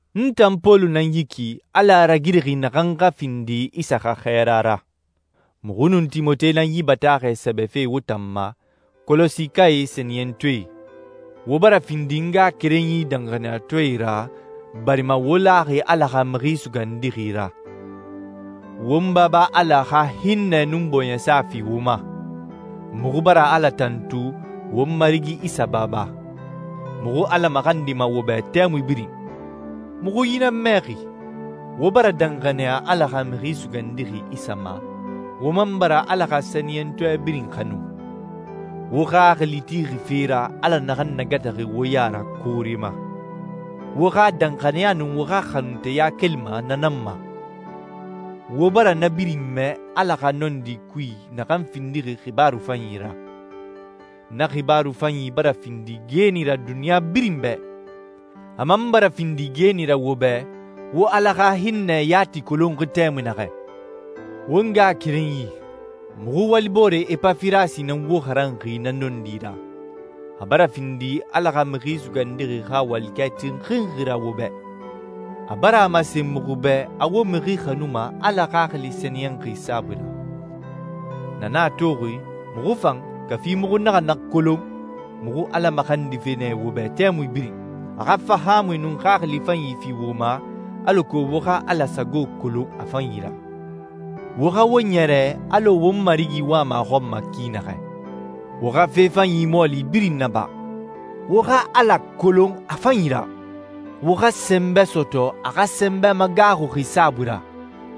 N tan Pɔlu nan yi ki, Ala a ragirixi naxan xa findi Isa xa xɛɛra ra. Muxu nun Timote nan yi bataaxɛ sɛbɛfe wo tan ma, Kɔlɔsikae sɛniyɛntɔɛe. Wo bara findi n ngaxakerenyi danxaniyatɔɛ ra barima wo laxi Ala xa Mixi Sugandixi ra. Won Baba Ala xa hinnɛ nun bɔɲɛsa fi wo ma. Muxu bara Ala tantu, won Marigi Isa Baba. Muxu Ala maxandima wo bɛ tɛmui birin. Muxu yi nan mɛxi, wo bara danxaniya Ala xa Mixi Sugandixi Isa ma, wo man bara Ala xa sɛniyɛntɔɛ birin xanu. Wo xaxili tixi fe ra Ala naxan nagataxi wo ya ra koore ma. Wo xa danxaniya nun wo xa xanunteya kelima na nan ma. Wo bara na birin mɛ Ala xa nɔndi kui naxan findixi xibaaru fanyi ra. Na xibaaru fanyi bara findi geeni ra duniɲa birin bɛ. A man bara findi geeni ra wo bɛ wo Ala xa hinnɛ yati kolonxi tɛmui naxɛ. Won ngaxakerenyi, muxu waliboore Epafirasi nan wo xaranxi na nɔndi ra. A bara findi Ala xa Mixi Sugandixi xa walikɛ tinxinxi ra wo bɛ. A bara a masen muxu bɛ a wo mixi xanuma Ala Xaxili Sɛniyɛnxi saabui ra. Na nan a toxi, muxu fan, kafi muxu naxa na kolon, muxu Ala maxandife nɛ wo bɛ tɛmui birin, a xa fahaamui nun xaxili fanyi fi wo ma alako wo xa Ala sago kolon a fanyi ra. Wo xa wo ɲɛrɛ alɔ won Marigi wama a xɔn ma ki naxɛ. Wo xa fe fanyi mɔɔli birin naba. Wo xa Ala kolon a fanyi ra. Wo xa sɛnbɛ sɔtɔ a xa sɛnbɛ magaaxuxi saabui ra,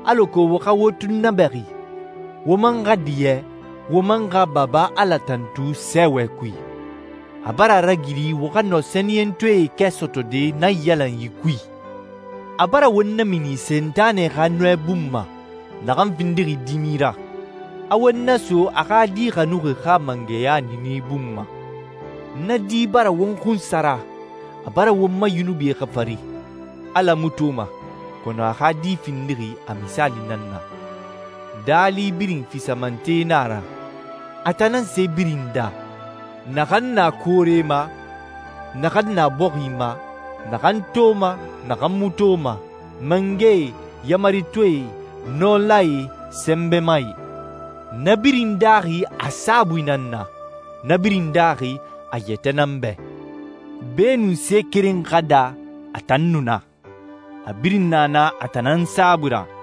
alako wo xa wo tunnabɛxi, wo man xa diɲɛ, wo man xa Baba Ala tantu sɛɛwɛ kui. A bara a ragiri wo xa nɔ sɛniyɛntɔɛe kɛ sɔtɔde naiyalanyi kui. A bara won namini Sentanɛ xa nɔɛ bun ma, naxan findixi dimi ra, a won naso a xa Di xanuxi xa mangɛya niini bun ma. Na di bara won xunsara, a bara won ma yunubie xafari. Ala mu toma, kɔnɔ a xa Di findixi a misaali nan na. Daali birin fisamante nan a ra. A tan nan se birin daa, naxan na koore ma, naxan na bɔxi ma, naxan toma, naxan mu toma, mangɛe, yaamaritɔɛe, nɔlae, sɛnbɛmae. Na birin daaxi a saabui nan na, na birin daaxi a yɛtɛ nan bɛ. Beenun se keren xa daa, a tan nu na. A birin na na a tan nan saabui ra.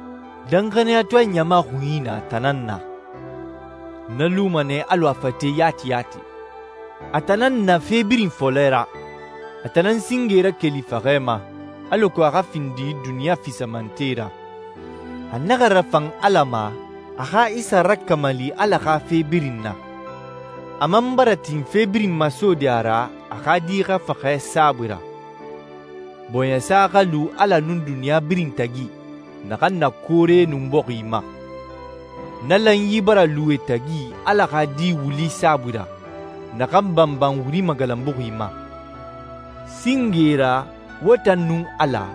Danxaniyatɔɛ ɲama xunyi na a tan nan na. Na luma nɛ alɔ a fate yati yati. A tan nan na fe birin fɔlɛ ra. A tan nan singe rakeli faxɛ ma, alako a xa findi duniɲa fisamante ra. A naxa rafan Ala ma a xa Isa rakamali Ala xa fe birin na. A man bara tin fe birin masode a ra a xa Di xa faxɛ saabui ra. Bɔɲɛsa xa lu Ala nun duniɲa birin tagi, naxan na koore nun bɔxi ma. Na lanyi bara lu e tagi Ala xa Di wuli saabui ra, naxan banban wuri magalanbuxi ma. Singe ra, wo tan nun Ala,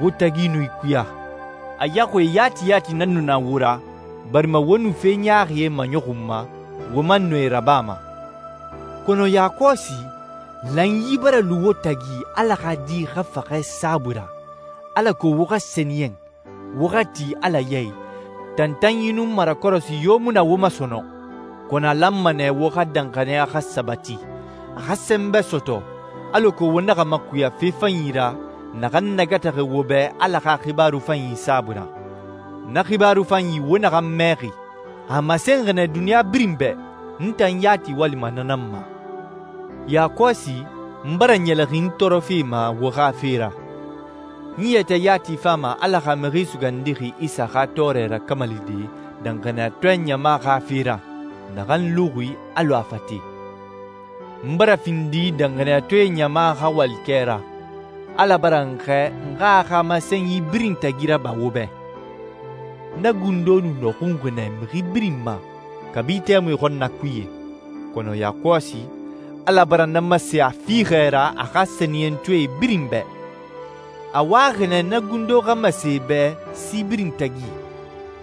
wo tagi nu ikuya. A yaxuie yati yati nan nu na wo ra, barima wo nu fe ɲaaxie maɲɔxunma, wo man nu e rabama. Kɔnɔ yakɔsi, lanyi bara lu wo tagi Ala xa Di xa faxɛ saabui ra, alako wo xa sɛniyɛn, wo xa ti Ala ya i, tantanyi nun marakɔrɔsi yo mu na wo ma sɔnɔn. Kɔnɔ a lanma nɛ wo xa danxaniya xa sabati, a xa sɛnbɛ sɔtɔ, alako wo naxa makuya fe fanyi ra naxan nagataxi wo bɛ Ala xa xibaaru fanyi saabui ra. Na xibaaru fanyi wo naxan mɛxi, a masenxi nɛ duniɲa birin bɛ. N tan yati walima na nan ma. Yakɔsi, n bara ɲɛlɛxin n tɔɔrɔfe ma wo xa fe ra. N yɛtɛ yati fama Ala xa Mixi Sugandixi Isa xa tɔɔrɛ rakamalide danxaniyatɔɛ ɲama xa fe ra, naxan luxi alɔ a fate. N bara findi danxaniyatɔɛe ɲama xa walikɛ ra. Ala bara n xɛɛ n xa a xa masenyi birin tagi raba wo bɛ. Na gundo nu nɔxunxi nɛ mixi birin ma, kabi tɛmui xɔnnakuye. Kɔnɔ yakɔsi, Ala bara na masen a fiixɛ ra a xa sɛniyɛntɔɛe birin bɛ. A waxi nɛ na gundo xa masen e bɛ si birin tagi,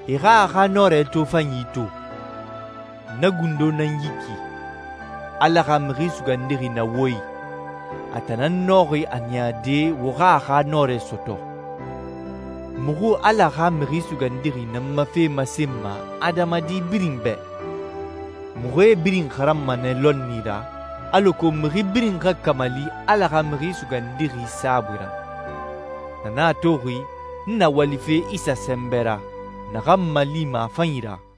e xa a xa nɔrɛ tofanyi to. Na gundo nan yi ki, Ala xa Mixi Sugandixi na wo i, a tan nan nɔxi a niyade wo xa a xa nɔrɛ sɔtɔ. Muxu Ala xa Mixi Sugandixi nan ma fe masenma adamadi birin bɛ. Muxu e birin xaranma nɛ lɔnni ra, alako mixi birin xa kamali Ala xa Mixi Sugandixi saabui ra. Na nan a toxi, n na walife Isa sɛnbɛ ra, naxan n malima a fanyi ra.